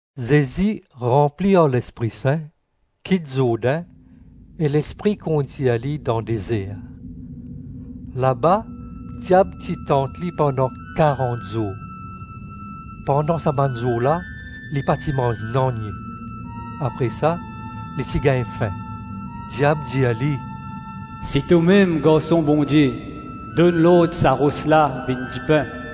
Zezi, ranpli ar Lespri Sin, kit Zourdin, e Lespri kondir li dan dezer. Laba diab ti tant li pandan karant zour. Pandan sa bann zour la, li pa ti manz nanye; apre sa, li ti gagn fin. Diab dir li, “Si tomem Garson Bondie donn lord sa ros la vinn dipin.”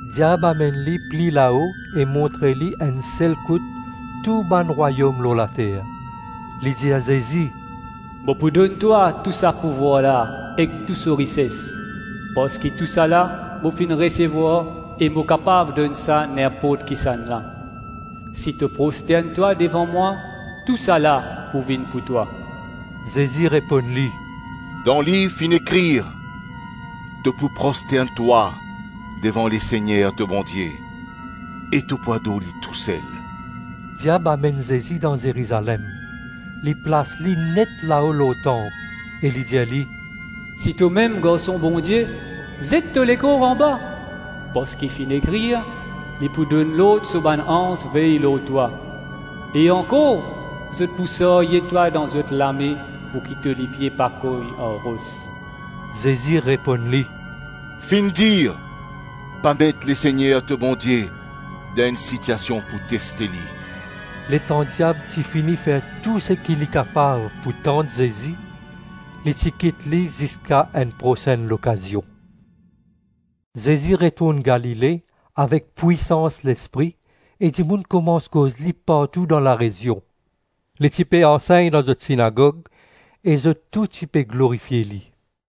Diab amenn li pli lao e montre li enn sel kout tou bann rwayom lor later. Li dir Zezi, “Mo pou donn twa tou sa pouvwar la ek tou so rises, parski tousala mo finn resevwar e mo kapav donn sa ninport kisannla. Si to prostern twa devan mwa, tousala pou vinn pou twa.” Zezi reponn li, “Dan liv finn ekrir: ‘To pou prostern twa devan Lesegner to Bondie, e to pou ador li tousel.’” Diab amenn Zezi dan Zerizalem, li plas li net lao lor tanp, e li dir li, “Si tomem Garson Bondie, zet to lekor anba, parski finn ekrir, ‘Li pou donn lord so bann anz vey lor twa,’ e ankor, ‘Zot pou sarye twa dan zot lame pouki to lipie pa kogn ar ros.’” Zezi reponn li, “Finn dir: ‘Pa met Lesegner to Bondie dan enn sitiasion pou teste li.’” Letan diab ti fini fer tou seki li kapav pou tant Zezi, li ti kit li ziska enn prosenn lokazion. Zezi retourn Galile avek pwisans Lespri e dimoun koumans koz li partou dan larezion. Li ti pe ansegn dan zot sinagog, e zot tou ti pe glorifie li.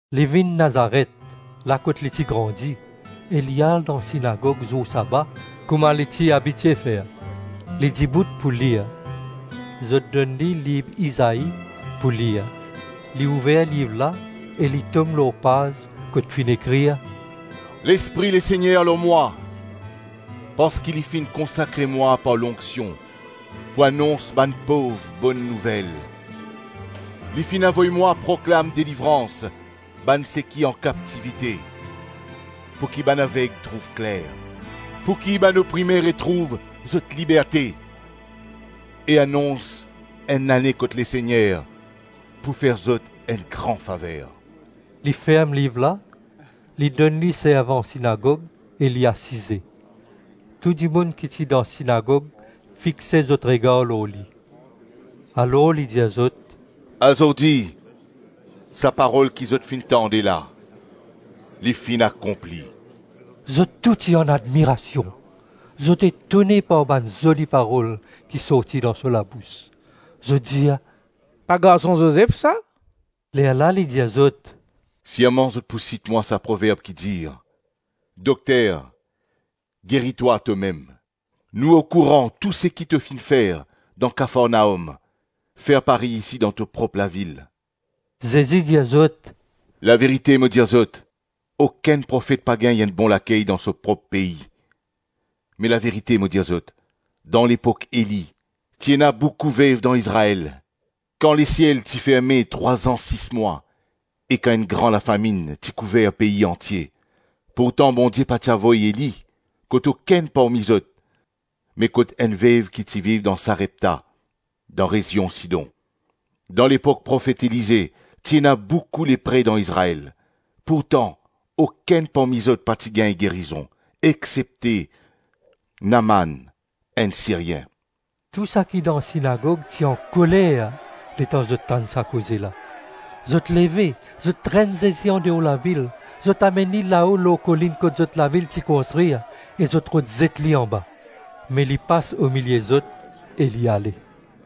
Li vinn Nazaret, la kot li ti grandi, e li al dan sinagog zour saba, kouma li ti abitie fer. Li dibout pou lir. Zot donn li liv Izai pou lir. Li ouver liv la e li tom lor paz kot finn ekrir: “Lespri Lesegner lor mwa, parski Li finn konsakre mwa par lonksion pou anons bann pov Bonn Nouvel. Li finn avoy mwa proklam delivrans bann seki an kaptivite, pouki bann aveg trouv kler, pouki bann oprime retrouv zot liberte, e anons enn lane kot Lesegner pou fer zot enn gran faver.” Li ferm liv la, li donn li servan sinagog, e li asize. Tou dimoun ki ti dan sinagog fixe zot regar lor li. Alor li dir zot, “Azordi sa Parol ki zot finn tande la, li finn akonpli.” Zot tou ti an admirasion; zot etone par bann zoli parol ki sorti dan so labous. Zot dir, “Pa garson Zozef sa?” Lerla li dir zot, “Sirman zot pou sit mwa sa proverb ki dir, ‘Dokter, geri twa tomem. Nou okouran tou seki to finn fer dan Kafarnaom, fer parey isi dan to prop lavil.’” Zezi dir zot, “Laverite mo dir zot: okenn profet pa gagn enn bon lakey dan so prop pei. Me laverite mo dir zot, dan lepok Eli ti ena boukou vev dan Izrael, kan lesiel ti ferme trwa-zan sis mwa, e kan enn gran lafaminn ti kouver pei antie; pourtan Bondie pa ti avoy Eli kot okenn parmi zot me kot enn vev ki ti viv dan Sarepta, dan rezion Sidon. Dan lepok profet Elize ti ena boukou lepre dan Izrael, pourtan okenn parmi zot pa ti gagn gerizon, exsepte Naaman, enn Syrien.” Tou seki dan sinagog ti ankoler letan zot tann sa koze la. Zot leve, zot trenn Zezi andeor lavil, zot amenn li lao lor kolinn kot zot lavil ti konstrir, e zot rod zet li anba. Me li pas omilie zot e li ale.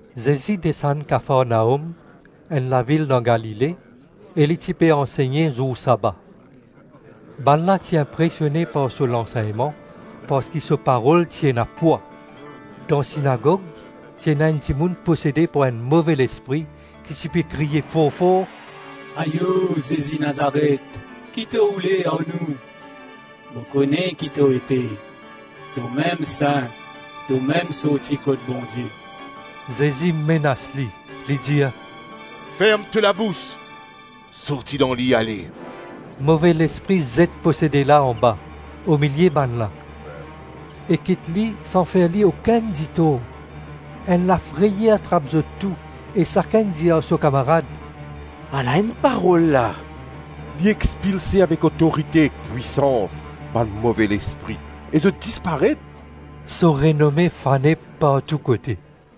Zezi desann Kafarnaom, enn lavil dan Galile, e li ti pe ansegne zour saba. Bannla ti inpresione par so lansegnman parski so parol ti ena pwa. Dan sinagog ti ena enn dimoun posede par enn move lespri ki ti pe kriye for-for, “Ayo, Zezi Nazaret, ki to oule ar nou? Mo kone ki to ete; tomem Sin, tomem sorti kot Bondie.” Zezi menas li, li dir, “Ferm to labous, sorti dan li, ale.” Move lespri zet posede la anba, omilie bannla, e kit li san fer li okenn ditor. Enn lafreyer trap zot tou e sakenn dir ar so kamarad, “Ala enn parol la! Li expilse avek otorite ek pwisans bann move lespri, e zot disparet.” So renome fane partou kote.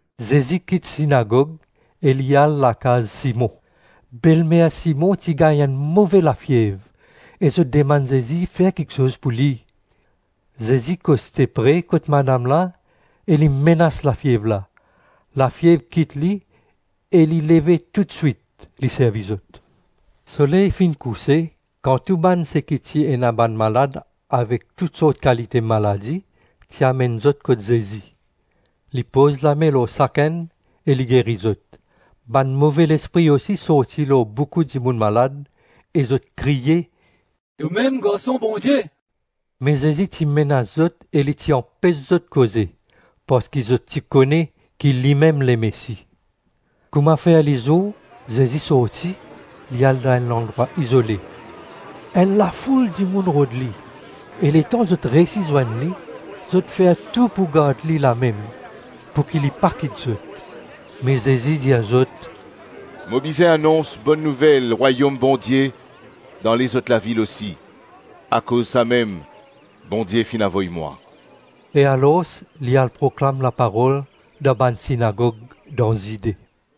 Zezi kit sinagog e li al lakaz Simon. Belmer Simon ti gagn enn move lafiev, e zot dimann Zezi fer kiksoz pou li. Zezi koste pre kot madam la e li menas lafiev la. Lafiev kit li, e li leve toutswit, li servi zot. Soley finn kouse, kan tou bann seki ti ena bann malad avek tou sort kalite maladi, ti amenn zot kot Zezi. Li poz lame lor sakenn e li geri zot. Bann move lespri osi sorti lor boukou dimoun malad, e zot kriye, “Tomem Garson Bondie!” Me Zezi ti menas zot e li ti anpes zot koze, parski zot ti kone ki limem Lemesi. Kouma fer lizour, Zezi sorti, li al dan enn landrwa izole. Enn lafoul dimoun rod li, e letan zot reysi zwenn li, zot fer tou pou gard li lamem, pouki li pa kit zot. Me Zezi dir zot, “Mo bizin anons Bonn Nouvel Rwayom Bondie dan lezot lavil osi; akoz samem Bondie finn avoy mwa.” E alors li al proklam laparol dan bann sinagog dan Zide.